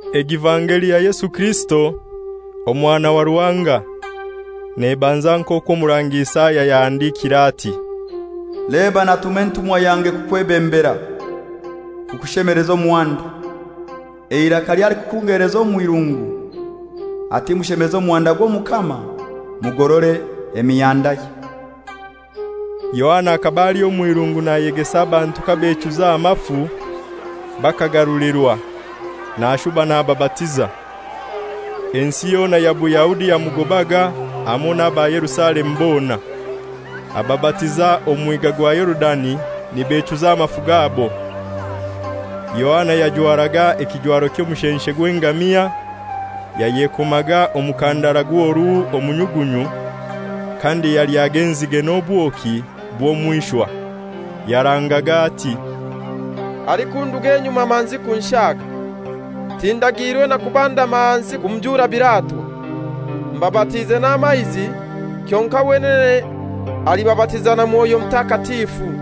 evangeli ya Yesu Kirisito, Omwana wa Ruhanga. Nebanza nk'okwo Omurangi Isaya yahandikiire ati, «Leba, natuma entumwa yange kukwebembera, kukushemeleza omuhanda; eiraka ly'alikukungeleza omw'irungu, ati: Mushemeze omuhanda gw'Omukama, mugorore emihandaye.» Yohana akaba ali omw'irungu nayegesa abantu kabechuza amafu, bakagarulirwa, nashuba nababatiza. Ensi yona ya Buyahudi yamugobaga, hamoi n'aba Yerusalemu bona. Ababatiza omu Mwiga gwa Yorudani nibechuza amafu gabo. Yohana yajwaraga ekijwaro ky'omushenshe gw'engamia, yayekomaga omukandara gw'oruhu omu nyugunyu, kandi yalyaga enzige n'obwoki bw'omw'ishwa. Yarangaga ati, «Alikunduga enyuma manzi kunshaaga, tindagiirwe na kubandama hansi kumujuura biratwa. Mbabatiize n'amaizi, kyonkai wenene alibabatiza na Mwoyo Mutakatifu.»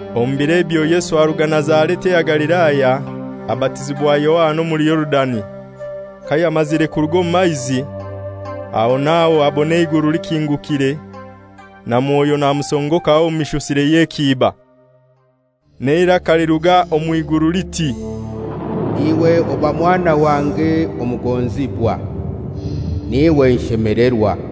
Omu biro ebyo Yesu aruga Nazareti eya Galilaya abatizibwa Yohana omuli Yorudani. Kayamazire kuruga omu maizi, aho n'aho abona eiguru likingukire, na Mwoyo namusongokaho omu mishusire y'ekiiba. N'eiraka liruga omw'iguru liti, «Iwe oba Mwana wange omugonzibwa, n'iwe nshemelerwa.»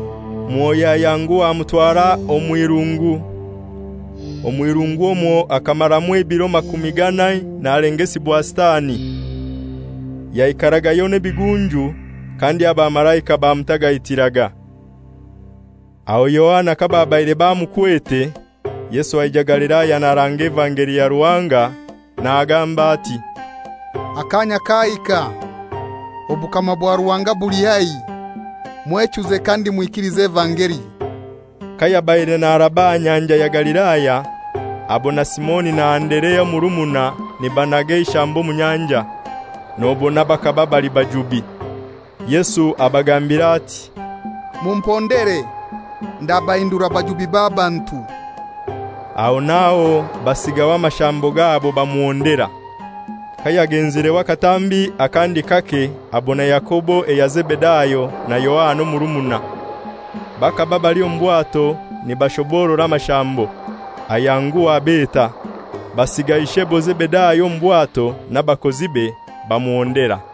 Mwoyo ayanguha amutwara omw'irungu. Omw'irungu omwo akamaramu ebiro makumi ganai nalengesibwa Sitani. Yaikaragayo n'ebigunju; kandi abamalaika bamutagaitiraga. Aho Yohana kababaire bamukwete, Yesu aija Galilaya naranga evangeli ya Ruhanga nagamba ati, «Akaanya kahika, obukama bwa Ruhanga buli haihi; mwechuze kandi mwikilize evangeli.» Kayabaire naraba aha Nyanja ya Galilaya abona Simoni na Anderea omurumuna nibanaga eishambo omu nyanja; nobona bakaba bali bajubi. Yesu abagambira ati, «Mumpondere, ndabahindura bajubi b'abantu.» Aho naho basiigaho amashambo gabo bamuhondera. Kayagenzireho akatambi akandi kake abona Yakobo eya Zebedayo na Yohana omurumuna, bakaba bali omu bwato nibashoborora amashambo. Ayanguha abeta, basiiga ishebo Zebedayo omu bwato n'abakozibe, bamuhondera.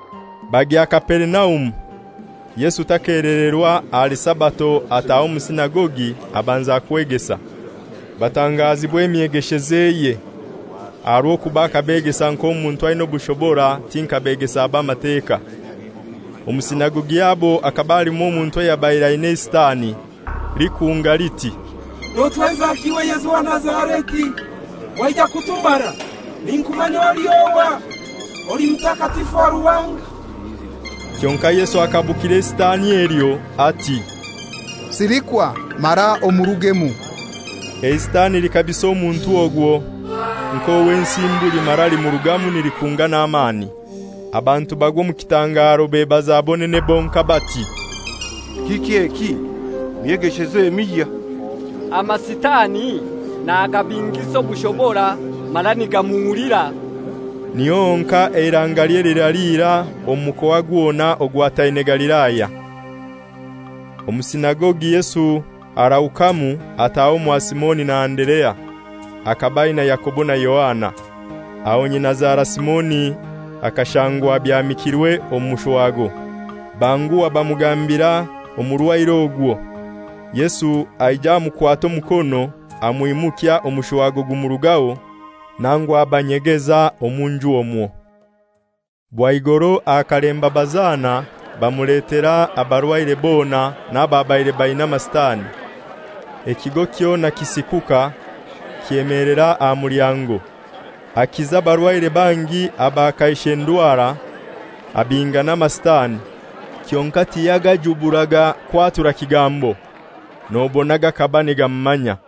Bagya Kaperinaumu. Yesu takelererwa, ahali Sabato ataha omu sinagogi abanza kwegesa. Batangazibwa emyegeshezeye, aha rw'okuba akabegesa nk'omuntu aina obushobora ti nka begesa ba Mateka. Omu sinagogi yabo akaba halimu omuntu ayabaire aina eiSitani. Likunga liti, «Notwenzaki iwe Yesu owa Nazareti? Waija kutumara? Ninkumanya oli ohai, oli Mutakatifu wa Ruhanga.» Kyonkai Yesu akabukira eiSitani elyo ati, «Silikwa mara omurugemu!» EiSitani likabisa omuntu ogwo nk'owensimbu limara limurugamu nilikunga n'amani. Abantu bagwa omu kitangaro, bebaza bonene bonkai nibagamba bati, «Kiki eki? Myegesheze emihya! AmaSitani nagabingisa obushobora mara nigamuhulira.» Niho honkai eiraangalye liraalira omu mukoa gwona ogwataine Galilaya.) Omu sinagogi Yesu arahukamu ataha omwa Simoni na Anderea. Akaba aina Yakobo na Yohana. Aho nyinazara Simoni akashangwa abyamikirwe omushwago, banguha bamugambira omurwaire ogwo. Yesu aija amukwata omukono amwimukya omushwago gumurugaho, nangu abatagaitira omu nju omwo. Bwaigoro aha kalemba bazana bamuletera abarwaire bona n'ababaire baina Amasitani. Ekigo kyona kisikuka kyemeelera aha mulyango. Akiza abarwaire bangi aba kaishe ndwara, abinga n'Amasitani. Kyonkai tiyagajuburaga kwatura kigambo, nobona gakaba nigamumanya.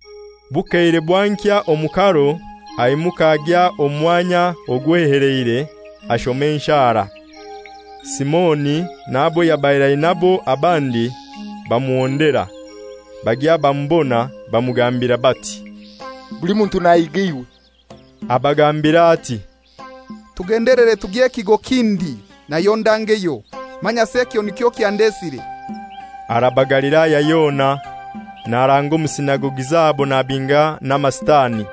Bukeire bwankya omu karo aimuka agya omu mwanya ogweheleire ashoma enshara. Simoni n'abo yabaire ainabo abandi bamuhondera. Bagya bamubona bamugambira bati, «Buli muntu nahiga iwe.» Abagambira ati, «Tugendelere tugye kigo kindi nayo ndangeyo; manyasi ekyo nikyo kyandesire.» Araba Galilaya yona, naranga omu sinagogi zabo nabinga n'Amasitani.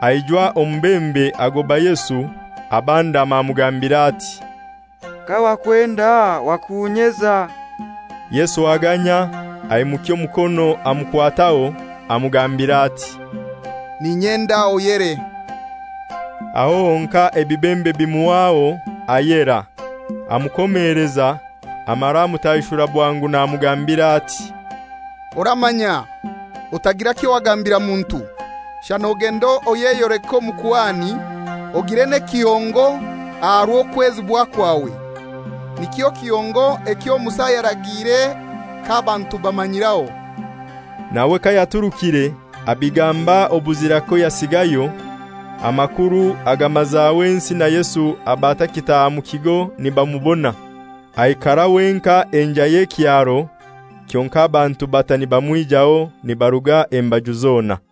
Aijwa omubembe agoba Yesu, abandama amugambira ati, «Kawakwenda wakunyeza.» Yesu aganya, aimukya omukono amukwataho, amugambira ati, «N'inyenda, oyere.» Aho honkai ebibembe bimuhwaho, ayera. Amukomeleza, amara amutaishura bwangu namugambira ati, «Oramanya otagira kyowagambira muntu; shana ogende oyeyoleke omukuhani, ogire n'ekihongo aha rw'okwezibwa kwawe: Nikyo kihongo ekyo Musa yaragiire k'abantu bamanyiraho.» Nawe kayaturukire abigamba obuzira koyasigayo, amakuru agamazaho ensi, na Yesu aba atakitaaha mu kigo nibamubona. Aikara wenkai enjai y'ekyaro kyonkai bantu bata nibamwijaho nibaruga embaju zona.